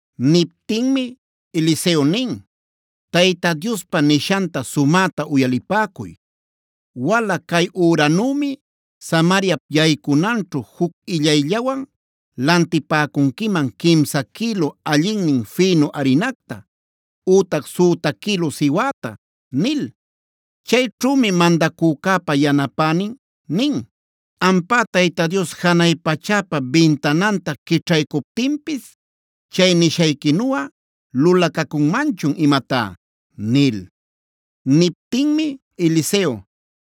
Niptinmi Eliseo nin: “Tayta Diospa nishanta sumäta uyalipäcuy: ‘Wala cay üranümi Samariap yaycunanćhu juc illayllawan lantipäcunquiman quimsa quïlu allinnin fïnu arinacta ütac süta quïlu siwäta’” nil. Chayćhümi mandacücäpa yanapänin nin: “Ampá Tayta Dios janay pachäpa bintananta quićhaycuptinpis chay nishayquinuꞌa lulacacunmanchun imatá” nil. Niptinmi Eliseo: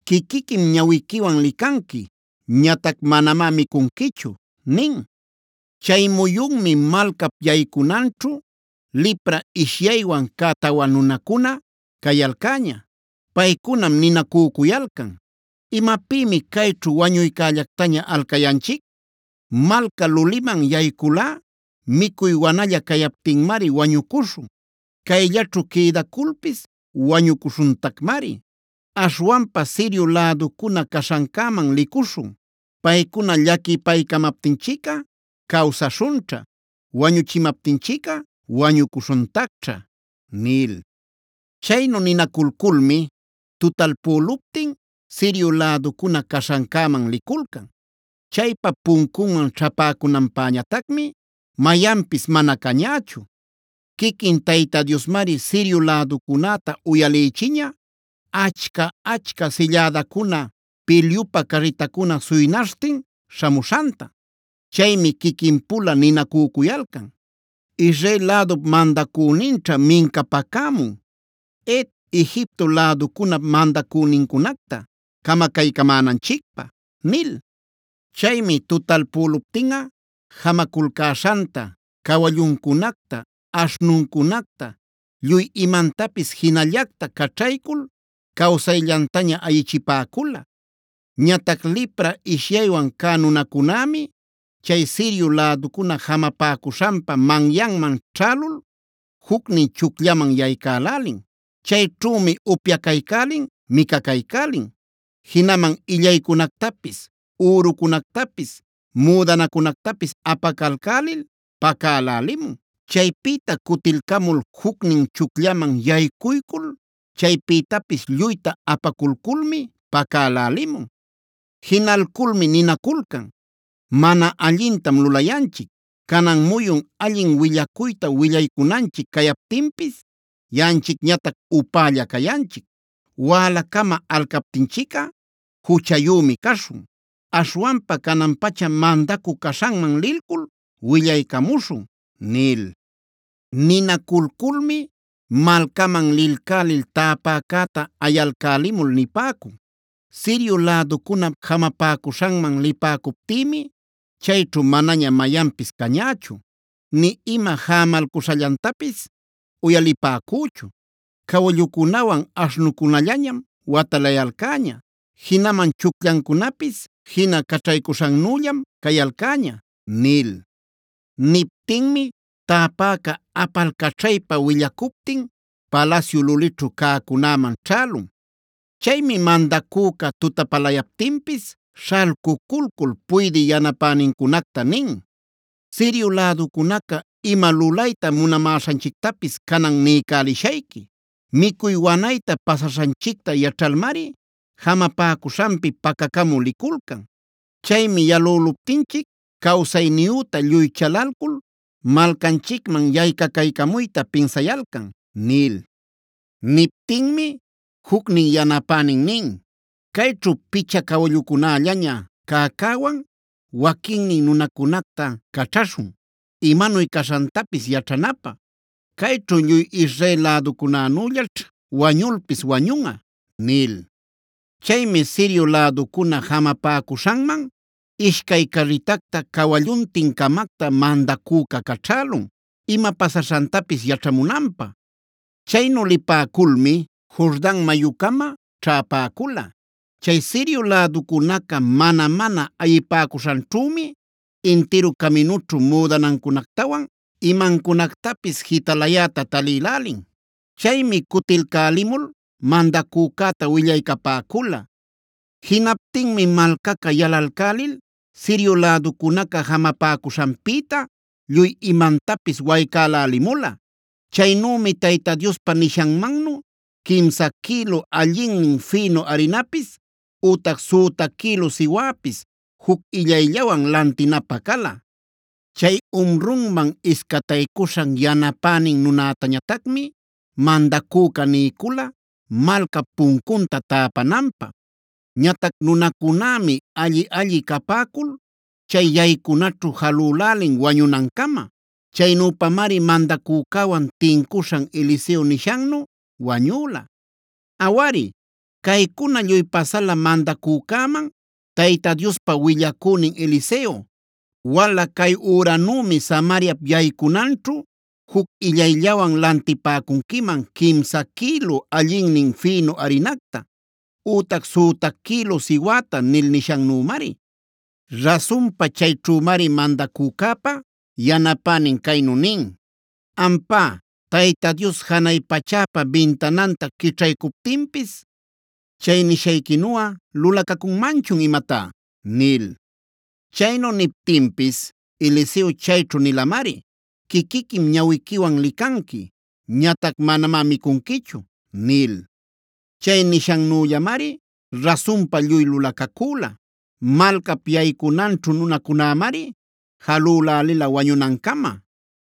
“Quiquiquim ñawiquiwan licanqui. Ñatac manamá micunquichu” nin. Chay muyunmi malcap yaycunanćhu lipra ishyaywan cä tawa nunacuna cayalcäña. Paycunam ninacücuyalcan: “¿Imapïmi cayćhu wañuycällactaña alcayanchic? Malca luliman yayculꞌa micuy wanalla cayaptinmari wañucuśhun. Cayllaćhu quïdaculpis wañucuśhuntacmari. Aśhwanpa Sirio läducuna caśhancäman licuśhun. Paycuna llaquipaycamaptinchicꞌa cawsaśhunćha; wañüchimaptinchicꞌa wañucuśhuntacćha” nil. Chaynu ninaculculmi tutalpüluptin Sirio läducuna caśhancäman liculcan. Chaypa puncunman ćhäpäcunanpäñatacmi mayanpis mana cañächu. Quiquin Tayta Diosmari Sirio läducunäta uyalïchiña achca-achca sillädacuna, pilyupä carritacuna suynaśhtin śhamuśhanta. Chaymi quiquin-pula ninacücuyalcan: “Israel lädup mandacüninćha mincapacämun Het, Egipto läducunap mandacünincunacta camacaycämänanchicpä” nil. Chaymi tutalpüluptinꞌa jamaculcäśhanta, cawalluncunacta, aśhnuncunacta, lluy imantapis jinallacta caćhaycul cawsayllantaña ayichipäcula. Ñatac lipra ishyaywan cä nunacunämi chay Sirio läducuna jamapäcuśhanpa manyanman ćhälul jucnin chucllaman yaycälälin. Chayćhümi upyacaycälin, micacaycälin, jinaman illaycunactapis, ürucunactapis, müdanacunactapis apacalcälil pacälälimun. Chaypïta cutilcamul jucnin chucllaman yaycuycul chaypïtapis lluyta apaculculmi pacälälimun. Jinalculmi ninaculcan: “Mana allintam lulayanchic. Canan muyun allin willacuyta willaycunanchic cayaptinpis yaꞌanchicñatac upälla cayanchic. Wälacama alcaptinchicꞌa juchayümi caśhun. Aśhwanpa canan-pacha mandacü caśhanman lilcul willaycamuśhun” nil. Ninaculculmi malcaman lilcälil täpäcäta ayalcälimul nipäcun: “Sirio läducunap jamapäcuśhanman lipäcuptïmi chayćhu manaña mayanpis cañächu, nï ima jamalcuśhallantapis uyalipäcüchu. Cawallucunawan aśhnucunallañam watalayalcäña. Jinaman chucllancunapis jina caćhaycuśhannüllam cayalcäña” nil. Niptinmi täpäca apalcaćhaypa willacuptin palasyu lulićhu cäcunäman ćhälun. Chaymi mandacüca tutapalayaptinpis śhalcuculcul puydï yanapänincunacta nin: “Sirio läducunaca ima lulayta munamäśhanchictapis canan niycälishayqui. Micuy wanayta pasaśhanchicta yaćhalmari jamapäcuśhanpi pacacamü liculcan. Chaymi yalüluptinchic cawsayniyüta lluy chalalcul malcanchicman yaycacaycamuyta pinsayalcan” nil. Niptinmi jucnin yanapänin nin: “Cayćhu picha cawallucunällaña cäcäwan waquinnin nunacunacta caćhaśhun, imanuy caśhantapis yaćhanapä. Cayćhu lluy Israel läducunänüllaćh wañulpis wañunꞌa” nil. Chaymi Sirio läducuna jamapäcuśhanman ishcay carritacta cawalluntin-camacta mandacüca caćhälun ima pasaśhantapis yaćhamunanpä. Chaynu lipäculmi Jordan mayucama ćhäpäcula. Chay Sirio läducunaca mana-mana ayipäcuśhanćhümi intiru caminućhu müdanancunactawan imancunactapis jitalayäta talïlälin. Chaymi cutilcälimul mandacücäta willaycapäcula. Jinaptinmi malcaca yalalcälil Sirio läducunaca jamapäcuśhanpïta lluy imantapis waycälälimula. Chaynümi Tayta Diospa nishanmannu quimsa quïlu allinnin fïnu arinapis ütac süta quïlu siwäpis juc illayllawan lantinapä cala. Chay umrunman iscataycuśhan yanapänin nunätañatacmi mandacüca niycula malcap puncunta täpananpä. Ñatac nunacunämi alli-alli capäcul chay yaycunaćhu jalülälin wañunancama. Chaynüpamari mandacücäwan tincuśhan Eliseo nishannu wañüla. Awari, caycuna lluy pasala mandacücäman Tayta Diospa willacünin Eliseo: “Wala cay üranümi Samariap yaycunanćhu juc illayllawan lantipäcunquiman quimsa quïlu allinnin fïnu arinacta ütac süta quïlu siwäta” nil nishannümari. Rasunpa chayćhümari mandacücäpa yanapänin caynu nin: “Ampá Tayta Dios janay pachäpa bintananta quićhaycuptinpis chay nishayquinuꞌa lulacacunmanchu imatá” nil. Chaynu niptinpis Eliseo chayćhu nilamari: “Quiquiquim ñawiquiwan licanqui. Ñatac manamá micunquichu” nil. Chay nishannüllamari rasunpa lluy lulacacüla. Malcap yaycunanćhu nunacunämari jalülälila wañunancama.